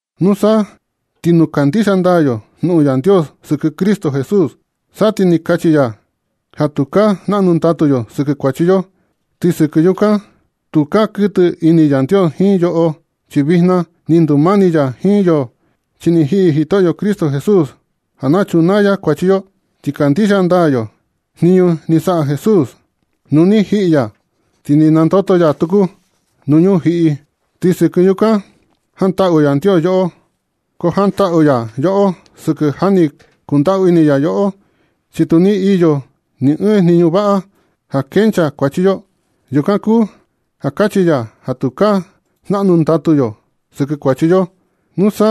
Nusa ti nu kandixia ndaa yo jnuꞌun Yandios sɨkɨ Cristo Jesús, sa ti kachi ya ja tukaa jnaꞌnu ndatu yo sɨkɨ kuachi yo. Ti sɨkɨ yukan, tukaa kuɨtɨ ini Yandios jiin yoꞌo, chi vijna ni ndumani ya jiin yo, chi ni jiꞌi Jitoꞌyo Cristo Jesús ja na chunaa ya kuachi yo. Ti kandixia ndaa yo jniñu ni saꞌa Jesús nu ni jiꞌi ya ti ni nandoto ya tuku nuu ñujiꞌi, ti sɨkɨ yukan jantaꞌu Yandios yoꞌo. Ko jantaꞌu ya yoꞌo sɨkɨ ja ni kundaꞌu ini ya yoꞌo, chi tu iyo ni ɨɨn jniñu vaꞌa yo ja kenchaa kuachi yo. Yukan kuu ja kachi ya ja tukaa jnaꞌnu ndatu yo sɨkɨ kuachi yo. Nusa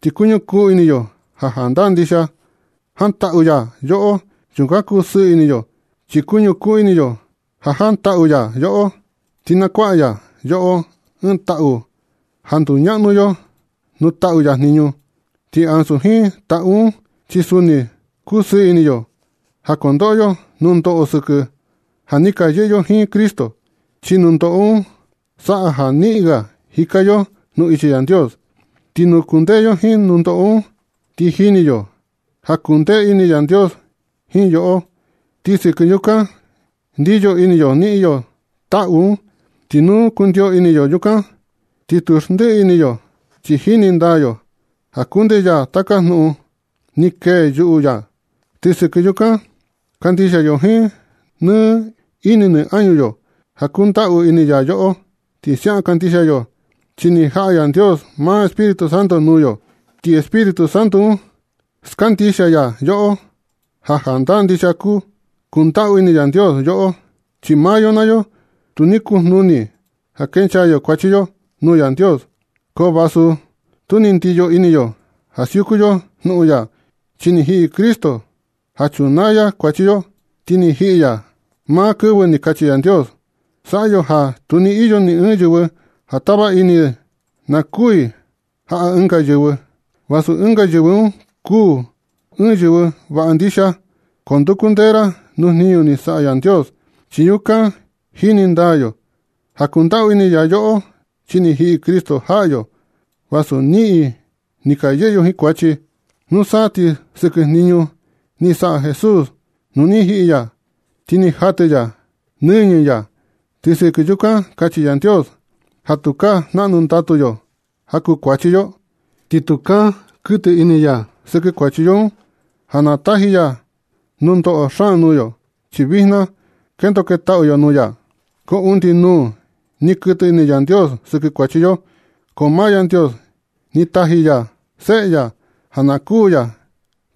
ti kuñukun ini yo ja jandaa ndixia ja jantaꞌu ya yoꞌo. Yukan kusɨɨ ini yo chi kuñukuu ini yo ja jantaꞌu ya yoꞌo, ti nakuaꞌa ya yoꞌo ɨɨn taꞌu ja nduñaꞌnu yo nuu taꞌu ya jniñu. Ti ansu jiin taꞌu un, chi suni kusɨɨ ini yo ja kondoꞌo yo nundoꞌo sɨkɨ ja ni ka yɨꞌɨ yo jiin Cristo, chi nundoꞌo un saꞌa ja niꞌin ga jika yo nuu ichi Yandios. Ti nu kundee yo jiin nundoꞌo un, ti jini yo ja kundee ini Yandios jiin yoꞌo, ti sɨkɨ yukan ndiyo ini yo niꞌin yo taꞌu un. Ti nu kundio ini yo yukan, ti tu xndiꞌi ini yo, chi jini ndaa yo ja kundee ya taka jnuꞌun ni kee yuꞌu ya, ti sɨkɨ yukan kandixia yo jiin nɨ ini nɨ añu yo ja kundaꞌu ini ya yoꞌo. Ti siaꞌan kandixia yo chi ni jaꞌa Yandios maa Espíritu Santo nuu yo, ti Espíritu un skandixia ya yoꞌo ja jandaa ndixia kundaꞌu ini Yandios yoꞌo. Chi sɨkɨ maa yo naa yo tu ni kojnuni ja kenchaa yo kuachi yo nuu Yandios. Ko vasu tu ni ndiyo ini yo ja siuku yo jnuꞌun ya, chi ni jiꞌi Cristo ja chunaa ya kuachi yo. Ti ni jiꞌi ya maa kɨvɨ ni kachi Yandios. Saꞌa yo ja. Tu ni iyo ni ɨɨn yɨvɨ ja tava ini na kuū i jaꞌa ɨnga yɨvɨ, vasu ɨnga yɨvɨ un kuu ɨɨn yɨvɨ vaꞌa ndixia. Ko nduku ndee ra nuu jniñu ni saꞌa Yandios, chi yukan jini ndaa yo ja kundaꞌu ini ya yoꞌo. Chi ni jiꞌi Cristo jaꞌa yo vasu niꞌin ni ka yɨꞌɨ yo jiin kuachi. Nusa ti sɨkɨ jniñu ni saꞌa Jesús nu ni jiꞌi ya ti ni jatɨ ya nɨñɨ ya, ti sɨkɨ yukan kachi Yandios ja tukaa jnaꞌnu ndatu yo ja kuu kuachi yo, ti tukaa kuɨtɨ ini ya sɨkɨ kuachi yo un ja na taji ya nundoꞌo xaan nuu yo, chi vijna kendo ketaꞌu yo nuu ya. Ko undi nuu ni kuɨtɨ ini Yandios sɨkɨ kuachi yo, ko maa Yandios ni taji ya seꞌe ya ja na kuū ya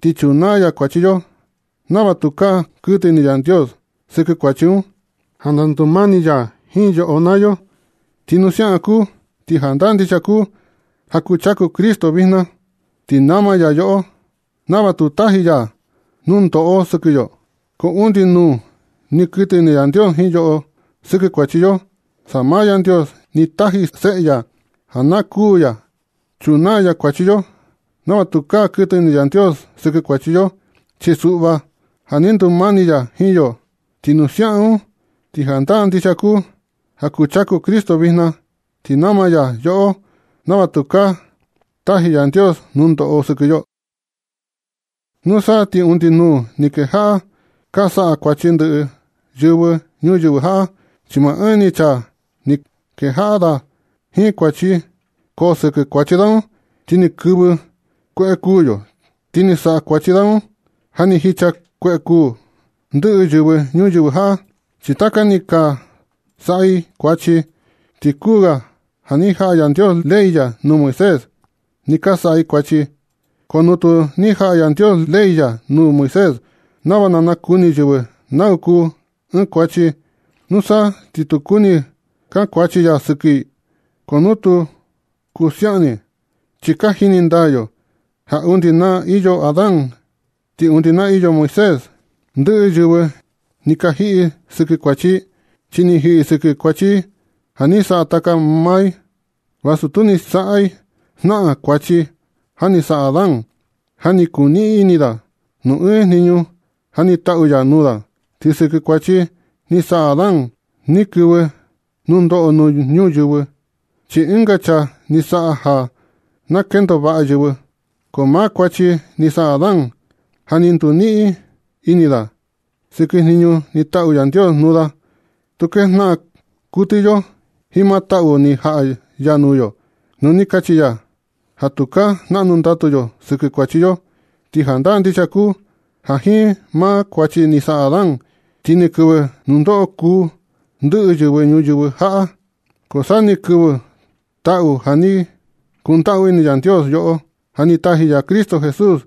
ti chunaa ya kuachi yo nava tukaa kuɨtɨ ini Yandios sɨkɨ kuachi un, ja na ndumani ya jiin yoꞌo naa yo. Ti nu siaꞌan kuu, ti jandaa ndixia kuu ja kuchaku Cristo vijna, ti nama ya yoꞌo nava tu taji ya nundoꞌo sɨkɨ yo. Ko undi nuu ni kuɨtɨ ini Yandios jiin yoꞌo sɨkɨ kuachi yo, sa maa Yandios ni taji seꞌe ya ja na kuū ya chunaa ya kuachi yo, nava tukaa kuɨtɨ ini Yandios sɨkɨ kuachi yo. Chi suꞌva ja na ndumani ya jiin yo. Ti nu siaꞌan un, ti jandaa ndixia kuu ja kuchaku Cristo vijna, ti nama ya yoꞌo nava tukaa taji Yandios nunoꞌo sɨkɨ yo. Nusa ti undi nuu ni kejaꞌa ka saꞌa kuachi ndɨꞌɨ yɨvɨ ñuyɨvɨ jaꞌa, chi maa ɨɨn ni chaa ni kejaꞌa da jiin kuachi, ko sɨkɨ kuachi da un, ti ni kɨvɨ kueꞌe kuū yo. Ti ni saꞌa kuachi da un ja ni jicha kueꞌe kuu ndɨꞌɨ yɨvɨ ñuyɨvɨ jaꞌa, chi taka ni ka saꞌa i kuachi. Ti kuu ga ja ni jaꞌa Yandios ley ya nuu Moisés ni ka saꞌa i kuachi. Ko nu tu ni jaꞌa Yandios ley ya nuu Moisés nava na nakuni yɨvɨ nau kuu ɨɨn kuachi, nusa ti tu kuni kankuachi ya sɨkɨ i, ko tu kuu siaꞌan ni. Chi ka jini ndaa yo ja undi na ni iyo Adán ti undi na ni iyo Moisés ndɨꞌɨ yɨvɨ ni ka jiꞌi i sɨkɨ kuachi i, chi ni jiꞌi i sɨkɨ kuachi ja ni saꞌa taka maa i, vasu tu ni saꞌa i jnaꞌan kuachi ja ni saꞌa Adán, ja ni kuniꞌin ini da nuu ɨɨn jniñu ja ni taꞌu ya nuu da. Ti sɨkɨ kuachi ni saꞌa Adán, ni kɨvɨ nundoꞌo nuu ñuyɨvɨ, chi ɨnga chaa ni saꞌa ja na kendo vaꞌa yɨvɨ. Ko maa kuachi ni saꞌa Adán, ja ni nduniꞌin ini da sɨkɨ jniñu ni taꞌu Yandios nuu da, tu kejnaꞌan kuɨtɨ yo jiin maa taꞌu ni jaꞌa ya nuu yo, nu ni kachi ya ja tukaa jnaꞌnu ndatu yo sɨkɨ kuachi yo. Ti jandaa ndixia kuu ja jiin maa kuachi ni saꞌa Adán, ti ni kɨvɨ nundoꞌo kuū ndɨꞌɨ yɨvɨ ñuyɨvɨ jaꞌa. Ko sa ni kɨvɨ taꞌu ja ni kundaꞌu ini Yandios yoꞌo ja ni taji ya Cristo Jesús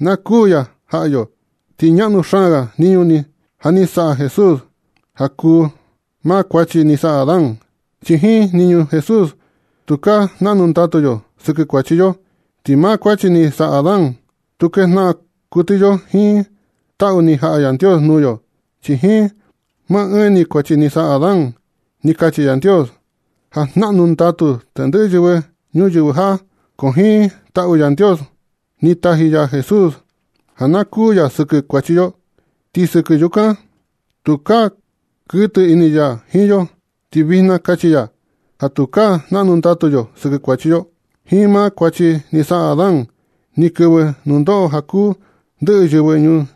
na kuū ya jaꞌa yo. Ti ñaꞌnu xaan ga jniñu ja ni saꞌa Jesús ja kuu maa kuachi ni saꞌa Adán, chi jiin jniñu Jesús tukaa jnaꞌnu ndatu yo sɨkɨ kuachi yo. Ti maa kuachi ni saꞌa Adán, tu kejnaꞌan kuɨtɨ yo jiin taꞌu ni jaꞌa Yandios nuu yo. Chi jiin maa ɨɨn ni kuachi ni saꞌa Adán, ni kachi Yandios ja jnaꞌnu ndatu tendɨꞌɨ yɨvɨ ñuyɨvɨ jaꞌa. Ko jiin taꞌu Yandios un, ni taji ya Jesús ja na kuū ya sɨkɨ kuachi yo, ti sɨkɨ yukan tukaa kuɨtɨ ini ya jiin yo, ti vijna kachi ya ja tukaa jnaꞌnu ndatu yo sɨkɨ kuachi yo. Jiin maa kuachi ni saꞌa Adán ni kɨvɨ nundoꞌo ja kuu ndɨꞌɨ yɨvɨ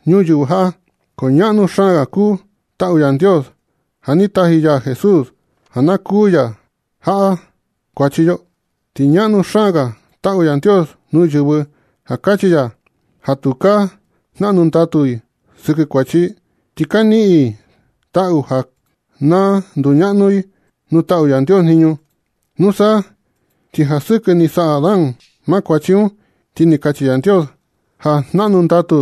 ñuyɨvɨ jaꞌa, ko ñaꞌnu xaan ga kuu taꞌu Yandios, ja ni taji ya Jesús ja na kuū ya jaꞌa kuachi yo. Ti ñaꞌnu xaan ga taꞌu Yandios nuu yɨvɨ ja kachi ya ja tukaa jnaꞌnu ndatu i sɨkɨ kuachi i, ti ka niꞌin i taꞌu ja na nduñaꞌnu i nuu taꞌu Yandios jniñu. Nusa ti ja sɨkɨ ni saꞌa Adán maa kuachi un, ti ni kachi Yandios ja jnaꞌnu ndatu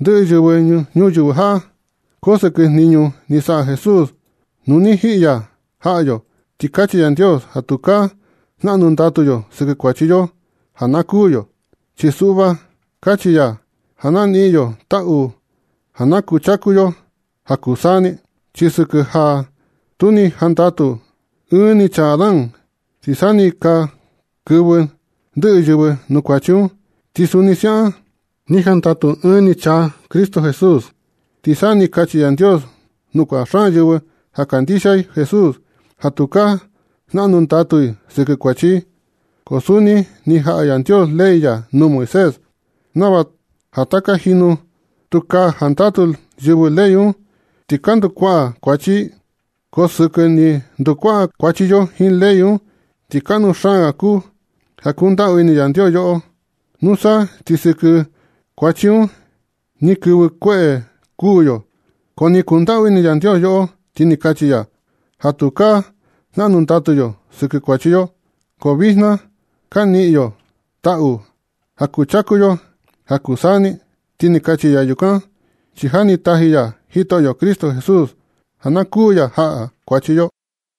ndɨꞌɨ yɨvɨ ñuyɨvɨ jaꞌa. Ko sɨkɨ jniñu ni saꞌa Jesús nu ni jiꞌi ya jaꞌa yo, ti kachi Yandios ja tukaa jnaꞌnu ndatu yo sɨkɨ kuachi yo ja na kuū yo. Chi suꞌva kachi ya ja na niꞌin yo taꞌu ja na kuchaku yo ja kuu taka saa ni. Chi sɨkɨ ja tu ni jandatu ɨɨn ni chaa Adán, ti sa ni ka kɨvɨ ndɨꞌɨ yɨvɨ nuu kuachi un. Ti suni siaꞌan ni jandatu ɨɨn ni chaa Cristo Jesús, ti sa ni kachi Yandios nuu kuaꞌa xaan yɨvɨ ja kandixia i Jesús ja tukaa jnaꞌnu ndatu i sɨkɨ kuachi i. Ko suni ni jaꞌa Yandios ley ya nuu Moisés nava ja taka jinu tu ka jandatu yɨvɨ ley un, ti ka ndukuaꞌa kuachi i. Ko sɨkɨ ni ndukuaꞌa kuachi yo jiin ley un, ti kaꞌnu xaan ga kuu ja kundaꞌu ini Yandios yoꞌo. Nusa ti sɨkɨ kuachi un ni kɨvɨ kueꞌe kuū yo. Ko ni kundaꞌu ini Yandios yoꞌo, ti kachi ya ja tukaa jnaꞌnu ndatu yo sɨkɨ kuachi yo, ko vijna ka niꞌin yo taꞌu ja kuchaku yo ja kuu saa ni. Ti kachi ya yukan chi ja ni taji ya Jitoꞌyo Cristo Jesús ja na kuū ya jaꞌa kuachi yo.